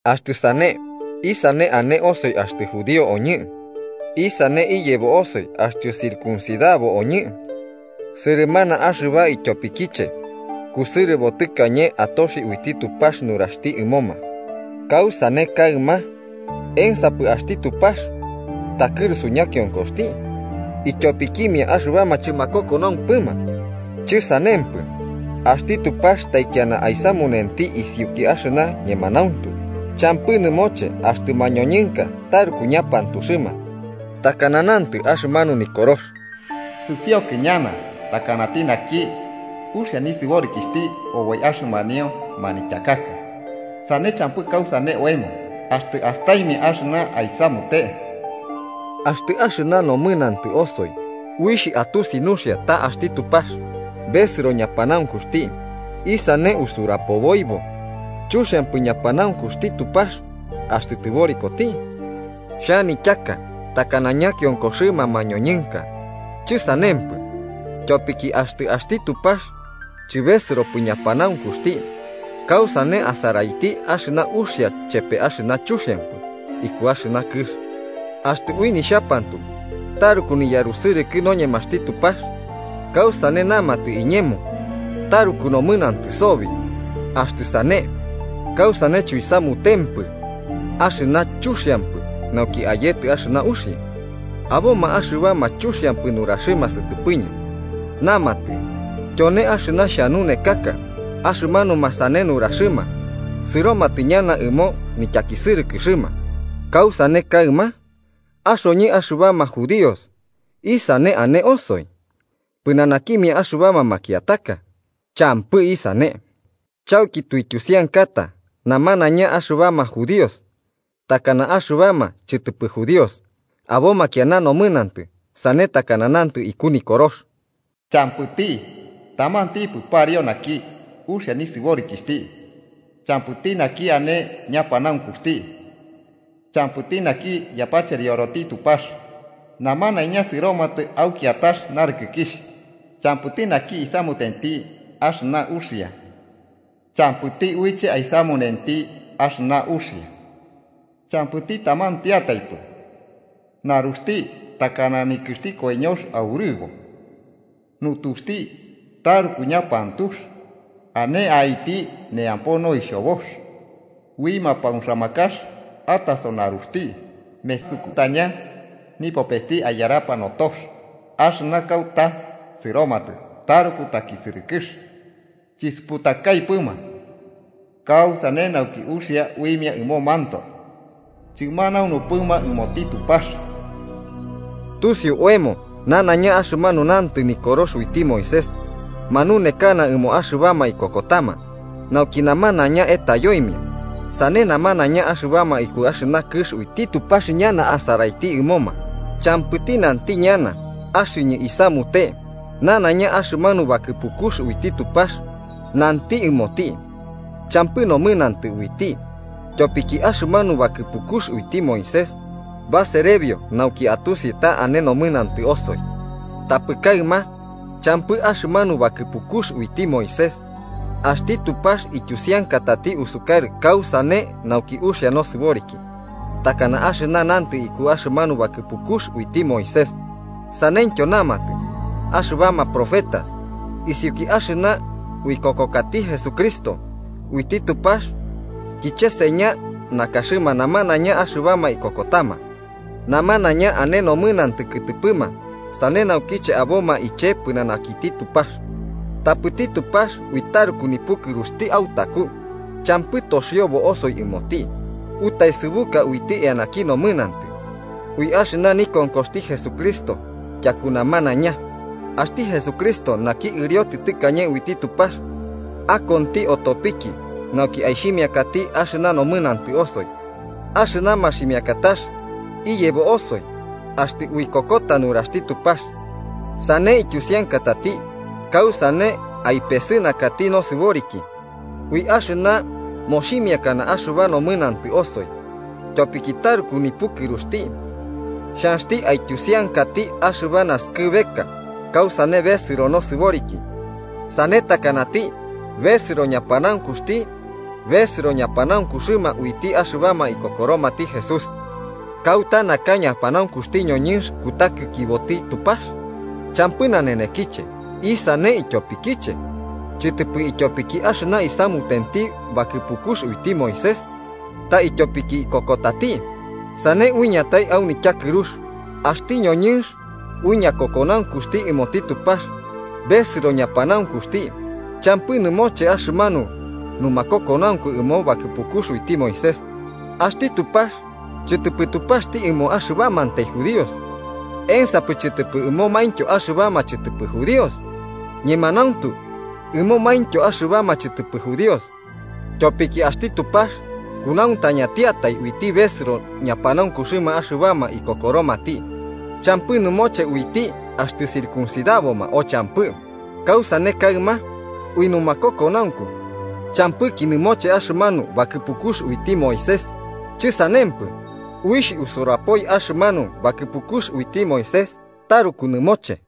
Axtɨ sane, ¿isane ane osoi axtɨ judío oñɨ? ¿Isane iyebo osoi axtɨ circuncidabo oñɨ? Sɨrɨmana axɨba ityopikiche. Kusɨrɨbo tɨkañe atoxi uiti Tupax nuraxti ɨmoma. ¿Kausane kaɨma? ¿Ensapɨ axti Tupax takɨrusu ñakionkoxti, ityopikimia axɨbama chɨmakokonaumpɨma? ¡Chɨsanempɨ! Axti Tupax taikiana aisamunenti isiuki axɨna ñemanauntu, champɨ nɨmoche axtɨ mañoñɨnka taruku ñapantuxɨma, takana nantɨ axɨmanu Nikorox: “Sɨsiokɨ ñana takanati naki uxia nisɨborikixhti oboi axɨmanio nanityaka, sane champɨ kausane aemo axtɨ astaimia axɨna aisamute.” Axtɨ axɨna nomɨnantɨ osoi uixh atusi nuxia ta axti Tupax besɨro ñapanaunkuxti, ¿isane usurapoboibo? ¿Chuxiampɨ ñapanaunkuxti Tupax axtɨ tɨborikoti? (Xhanityaka takana ñakionkoxɨma mañoñɨnka.) ¡Chɨsanempɨ! Tyopiki axtɨ axti Tupax, chɨbesɨropɨ ñapanaunkuxti, ¿kausane asaraiti axɨna uxia chepe axɨna chuxiampɨ iku axɨna kɨx? Axtɨ ui nixhapantu taruku niyarusɨrɨkɨ noñemaxti Tupax, ¿kausane namatɨ iñemo taruku nomɨnantɨ sobi? Axtɨ sane, ¿kausane chuisamutempɨ axɨna chuxiampɨ nauki ayetɨ axɨna uxia? Aboma axɨbama chuxiampɨ nuraxɨma sɨtɨpɨñɨ, namatɨ tyone axɨna xhanunekaka. Axɨmanuma sane nuraxɨma sɨromatɨ ñana ɨmo nityakisɨrɨkɨxɨma. ¿Kausane kaɨma? Axoñɨ axɨbama judíos, ¿isane ane osoi pɨnanakimia axɨbama makiataka? ¡Champɨ isane!, chauki tuityusiankata namanaiña, axɨbama judíos takana axɨbama chɨtɨpɨ judíos, aboma kiana nomɨnantɨ, sane takana nantɨ iku Nikorox: “¡Champɨti tamantipɨ pariu naki uxia nisɨborikixhti! Champɨti naki ane ñapanaunkuxti. Champɨti naki yapacherioroti Tupax. Namanaiña sɨromatɨ au kiatax narɨkɨkixh. Champɨti naki isamutenti axɨna uxia. ¡Champɨti uiche aisamunenti axɨna uxia! ¡Champɨti tamantiataipɨ! Naruxti takana nikɨxti koiñox aurɨbo. Nutuxti taruku ñapantux, ane aiti neampo noixhobox. Ui mapauxamakax ataso naruxti. Mesukutaña nipopesti aiyarapa notox. Axɨna kauta sɨromatɨ taruku takisɨrɨkɨx. Chisuputakaipɨma kausane nauki uxia uimia ɨmomantoe. Chɨmanaunupɨma ɨmoti Tupax.” Tusiu oemo nanaiña axɨmanu nantɨ Nikorox uiti Moisés, manunekana ɨmoma axɨbama ikokotama, nauki namanaiña etayoimia, sane namanaiña axɨbama ikuki axɨna kɨx uiti Tupax ñana asaraiti ɨmoma. Champɨti nanti ñana axɨñɨ isamute nanaiña axɨmanu bakɨpukux uiti Tupax nanti ɨmoti champɨ nomɨnantɨ uiti, tyopiki axɨmanu bakɨpukux uiti Moisés baserebio nauki atusi ta ane nomɨnantɨ osoi. Tapɨ kaɨma, champɨ axɨmanu bakɨpukux uiti Moisés, axti Tupax ityusiankatati usukarɨ kausane nauki uxia nosɨboriki, takana axɨna nantɨ iku axɨmanu bakɨpukux uiti Moisés saneityo namatɨ axɨbama profetas: isiuki axɨna uikokokati Jesucristo, uiti Tupax kicheseña nakaxɨma namanaiña axɨbama ikokotama. Namanaiña ane nomɨnantɨ kɨtɨpɨma sane naukiche aboma iche pɨnanakiti Tupax. Tapɨti Tupax ui taruku nipukɨruxti autaku, champɨ toxiobo osoi ɨmoti, utaesɨbuka uiti eanaki nomɨnantɨ, ui axɨna nikonkoxti Jesucristo tyaku namanaiña. Axti Jesucristo naki ɨriotitɨ tɨkañe uiti Tupax, akonti otopiki nauki aixhimiakati axɨna nomɨnantɨ osoi. Axɨna maximiakatax iyebo osoi axtɨ uikokota nuraxti Tupax. Sane ityusiankatati kausane aipesɨnakati nosɨboriki: ui axɨna moximiakana axɨba nomɨnantɨ osoi, tyopiki taruku nipukɨruxti. Xhanxti aityusiankati axɨba naskɨbeka kausane besɨro nosɨboriki. Sane takanati besɨro ñapanaunkuxti, besɨro ñapanaunkuxɨma uiti axɨbama ikokoromati Jesús. ¿Kauta naka ñapanaunkuxti ñoñɨnx kutakikiboti Tupax? ¡Champɨ nanenekiche! ¿Isane ityopikiche? Chɨtɨpɨ ityopiki axɨna isamutenti bakɨpukux uiti Moisés, ta ityopiki ikokotati. Sane uiñatai au nityakɨrux: axti ñoñɨnx ui ñakokonaunkuxti ɨmoti Tupax, besɨro ñapanaunkuxti, champɨ nɨmoche axɨmanu numakokonaunku ɨmo bakɨpukux uiti Moisés. ¿Axti Tupax chɨtɨpɨ Tupaxti ɨmoma axɨbamantai judíos? ¿Ensapɨ chɨtɨpɨ ɨmomaintyo axɨbama chɨtɨpɨ judíos? ¡Ñemanauntu ɨmomaintyo axɨbama chɨtɨpɨ judíos, tyopiki axti Tupax kunauntañatiatai: uiti besɨro ñapanaunkuxɨma axɨbama ikokoromati, champɨ nɨmoche uiti axtɨ circuncidaboma o champɨ! Kausane kaɨma, ¿ui numakokonaunku champɨki nɨmoche axɨmanu bakɨpukux uiti Moisés? ¡Chɨsanempɨ! Uixh usurapoi axɨmanu bakɨpukux uiti Moisés taruku nɨmoche.